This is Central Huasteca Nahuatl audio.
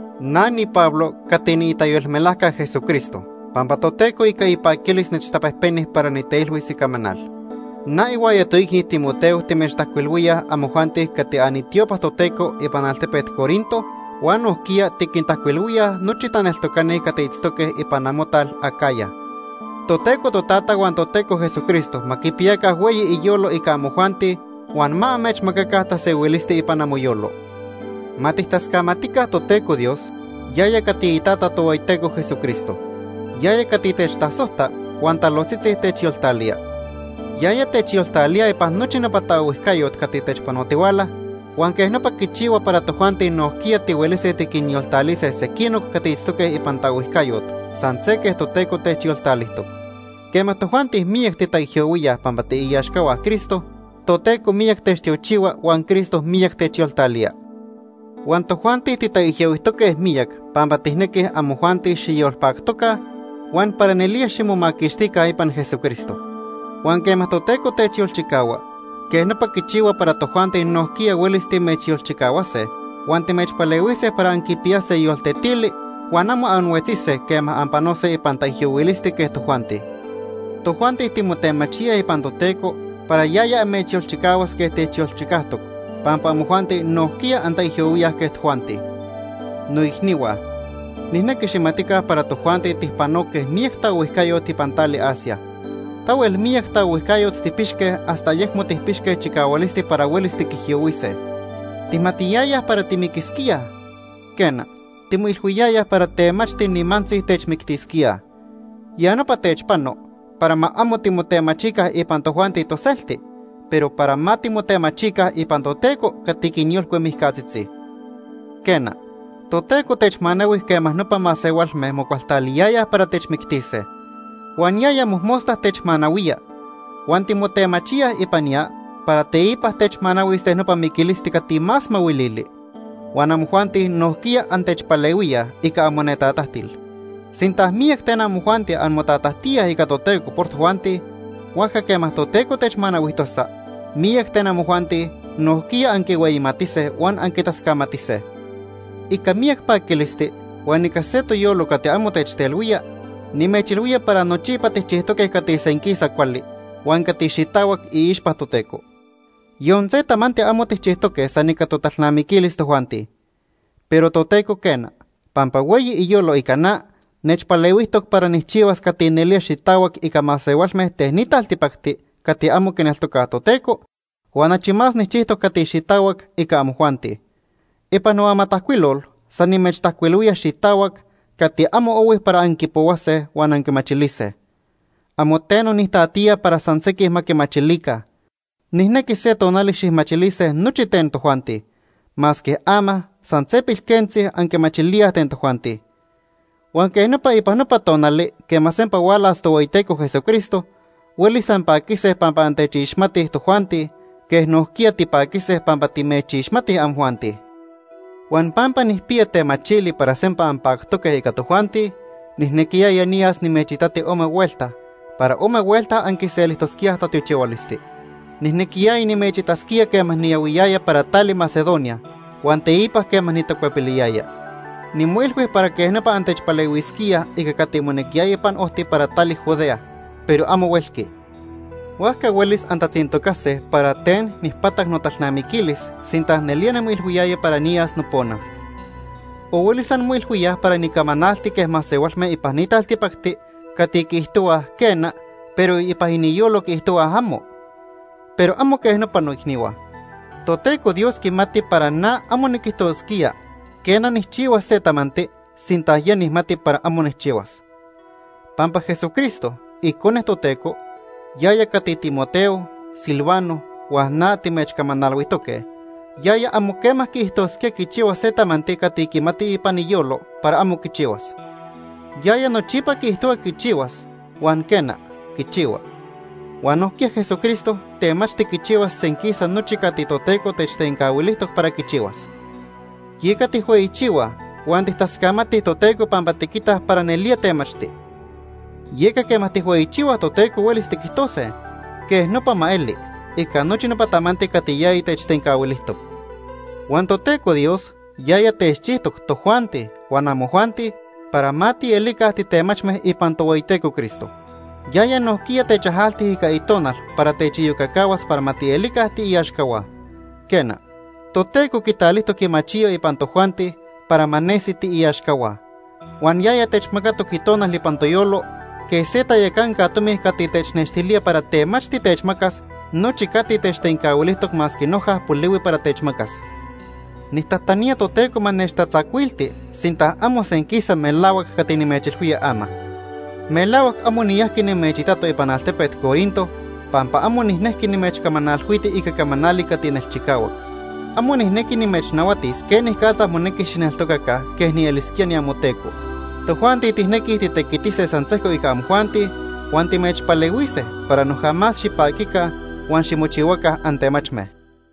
Na niPablo cati niitayolmelajca Jesucristo pampa Toteco ica ipaquilis nechtapejpeni para niteilhuis icamanal. Na ihuaya toicni Timoteo timechtajcuilhuíaj amojuanti cati anitiopa Toteco ipan altepet Corinto huan nojquiya tiquintajcuilhuíaj nochi taneltocani cati itztoque ipan amotal Acaya. Toteco Totata huan Toteco Jesucristo ma quipiyaca hueyi iniyolo ica amojuanti huan ma amechmacaca tasehuilisti ipan amoyolo. Ma tijtascamatica Toteco Dios, yaya cati iTata Tohueyiteco Jesucristo. Yaya cati techtasojta huan talojtzitzi techyoltalía. Yaya techyoltalía ipan nochi nopa taohuijcayot cati techpanotihuala huan quej nopa quichihua para tojuanti nojquiya tihuelise tiquinyoltalise sequinoc cati itztoque ipan taohuijcayot san se quej Toteco techyoltalijtoc. Quema tojuanti miyac titaijyohuíaj pampa tiiaxcahua Cristo, Toteco miyac techtiochihua huan Cristo miyac techyoltalía. Huan tojuanti titaijyohuijtoque miyac pampa tijnequij amojuanti xiyolpactoca huan para nelía ximomaquixtica ipan Jesucristo. Huan quema Toteco techyolchicahua, quej nopa quichihua para tojuanti nojquiya huelis timechyolchicahuase huan timechpalehuise para anquipiyase yoltetili huan amo anhuetzise quema anpanose ipan taijyohuilisti quej tojuanti. Tojuanti timotemachíaj ipan Toteco para yaya amechyolchicahuas quej techyolchicajtoc pampa amojuanti nojquiya antaijyohuíaj quej tojuanti. Noicnihua, nijnequi xijmatica para tojuanti tijpanoque miyac taohuijcayot ipan tali Asia. Tahuel miyac taohuijcayot tijpixque hasta ayecmo tijpixque chicahualisti para huelis tiquijyohuise. Tijmatiyayaj para timiquisquíaj. Quena, timoilhuiyayaj para temachti nimantzi techmictisquíaj. Ya nopa techpano para ma amo timotemachica ipan tojuanti toselti, pero para ma timotemachica ipan Toteco cati quinyolcui mijcatzitzi. Quena, Toteco techmanahui quema nopa masehualme mocualtaliyayaj para techmictise. Huan yaya mojmosta techmanahuía. Huan timotemachíaj ipan ya para teipa techmanahuis ten nopa miquilisti cati más mahuilili. Huan amojuanti nojquiya antechpalehuíaj ica amonetatajtil. Sinta miyac ten amojuanti anmotatajtíaj ica Toteco por tojuanti, huajca quema Toteco techmanahuijtosa, miyac ten amojuanti nojquiya anquihueyimatise huan anquitascamatise. Ica miyac paquilisti huan ica se toyolo cati amo techtelhuía, nimechilhuía para nochipa tijchijtoque cati senquisa cuali huan cati xitahuac iixpa Toteco. Yon se tamanti amo tijchijtoque san ica totalnamiquilis tojuanti. Pero Toteco quena, pampa hueyi iyolo ica na, nechpalehuijtoc para nijchihuas cati nelía xitahuac ica masehualme ten ni taltipacti cati amo quineltocaj Toteco huan achi más nijchijtoc cati xitahuac ica amojuanti. Ipan noamatajcuilol san nimechtajcuilhuía xitahuac cati amo ohui para anquipohuase huan anquimachilise. Amo teno nijtatiya para san sequij ma quimachilica. Nijnequi se tonali xijmachilise nochi ten tojuanti, masque ama san se pilquentzi anquimachilíaj ten tojuanti. Huan quej nopa ipan nopa tonali quema sempa hualas Tohueyiteco Jesucristo, huelis anpaquise pampa antechixmatij tojuanti, quej nojquiya tipaquise pampa timechixmatij amojuanti. Huan pampa nijpiya temachili para sempa anpactoque ica tojuanti, nijnequiyaya niyas nimechitati ome huelta, para ome huelta anquiselijtosquíaj tatiochihualisti. Nijnequiyaya nimechitasquía quema niyahuiyaya para tali Macedonia huan teipa quema nitacuepiliyaya. Nimoilhui para quej nopa antechpalehuisquíaj ica cati monequiyaya ipan ojti para tali Judea, pero amo huelqui. Huajca huelis antatzintocase para ten nijpatac notalnamiquilis sinta nelía nimoilhuiyaya para niyas nopona. O huelis anmoilhuíaj para nicamanalti quej masehualme ipan ni taltipacti cati quiijtohuaj, “quena”, pero ipan iniyolo quiijtohuaj, “amo”. Pero amo quej nopa, noicnihua. Toteco Dios quimati para na amo niquijtosquía, quena, nijchihuas se tamanti, sinta ya nijmati para amo nijchihuas. Pampa Jesucristo, Icone Toteco, yaya cati Timoteo, Silvano huan na timechcamanalhuijtoque, yaya amo quema quiijtosquía quichihuas se tamanti cati quimati ipan iyolo para amo quichihuas. Yaya nochipa quiijtohua quichihuas huan, quena, quichihua. Huan nojquiya Jesucristo temachti quichihuas senquisa nochi cati Toteco techtencahuilijtoc para quichihuas. Yeca tijhueyichihuaj huan tijtascamatij Toteco pampa tiquitaj para nelía temachti. Yeca quema tijhueyichihuaj Toteco huelis tiquijtose: “Quej nopa ma eli” ica nochi nopa tamanti cati yaya techtencahuilijtoc. Huan Toteco Dios yaya techchijtoc tojuanti huan amojuanti para ma tielica titemachme ipan Tohueyiteco Cristo. Yaya nojquiya techajalti ica Itonal para techiyocacahuas para ma tielica tiiaxcahua. Quena, Toteco quitalijtoc imachiyo ipan tojuanti para ma nesi tiiaxcahua. Huan yaya techmacatoc Itonal ipan toyolo quej se tayacanca tomi cati technextilía para temachti techmacas nochi cati techtencahuilijtoc masque noja polihui para techmacas. Nijtajtanía Toteco ma nechtatzacuilti sinta amo senquisa melahuac cati nimechilhuía ama. Melahuac amo niyajqui nimechitato ipan altepet Corinto pampa amo nijnejqui nimechtacahualtiti ica camanali cati nelchicahuac. Amo nijnequi nimechnahuatis quenicatza monequi xijneltocaca quej nielisquía niamoteco. Tojuanti tijnequij titequitise san sejco ica amojuanti huan timechpalehuise para noja más xipaquica huan ximochihuaca antemachme.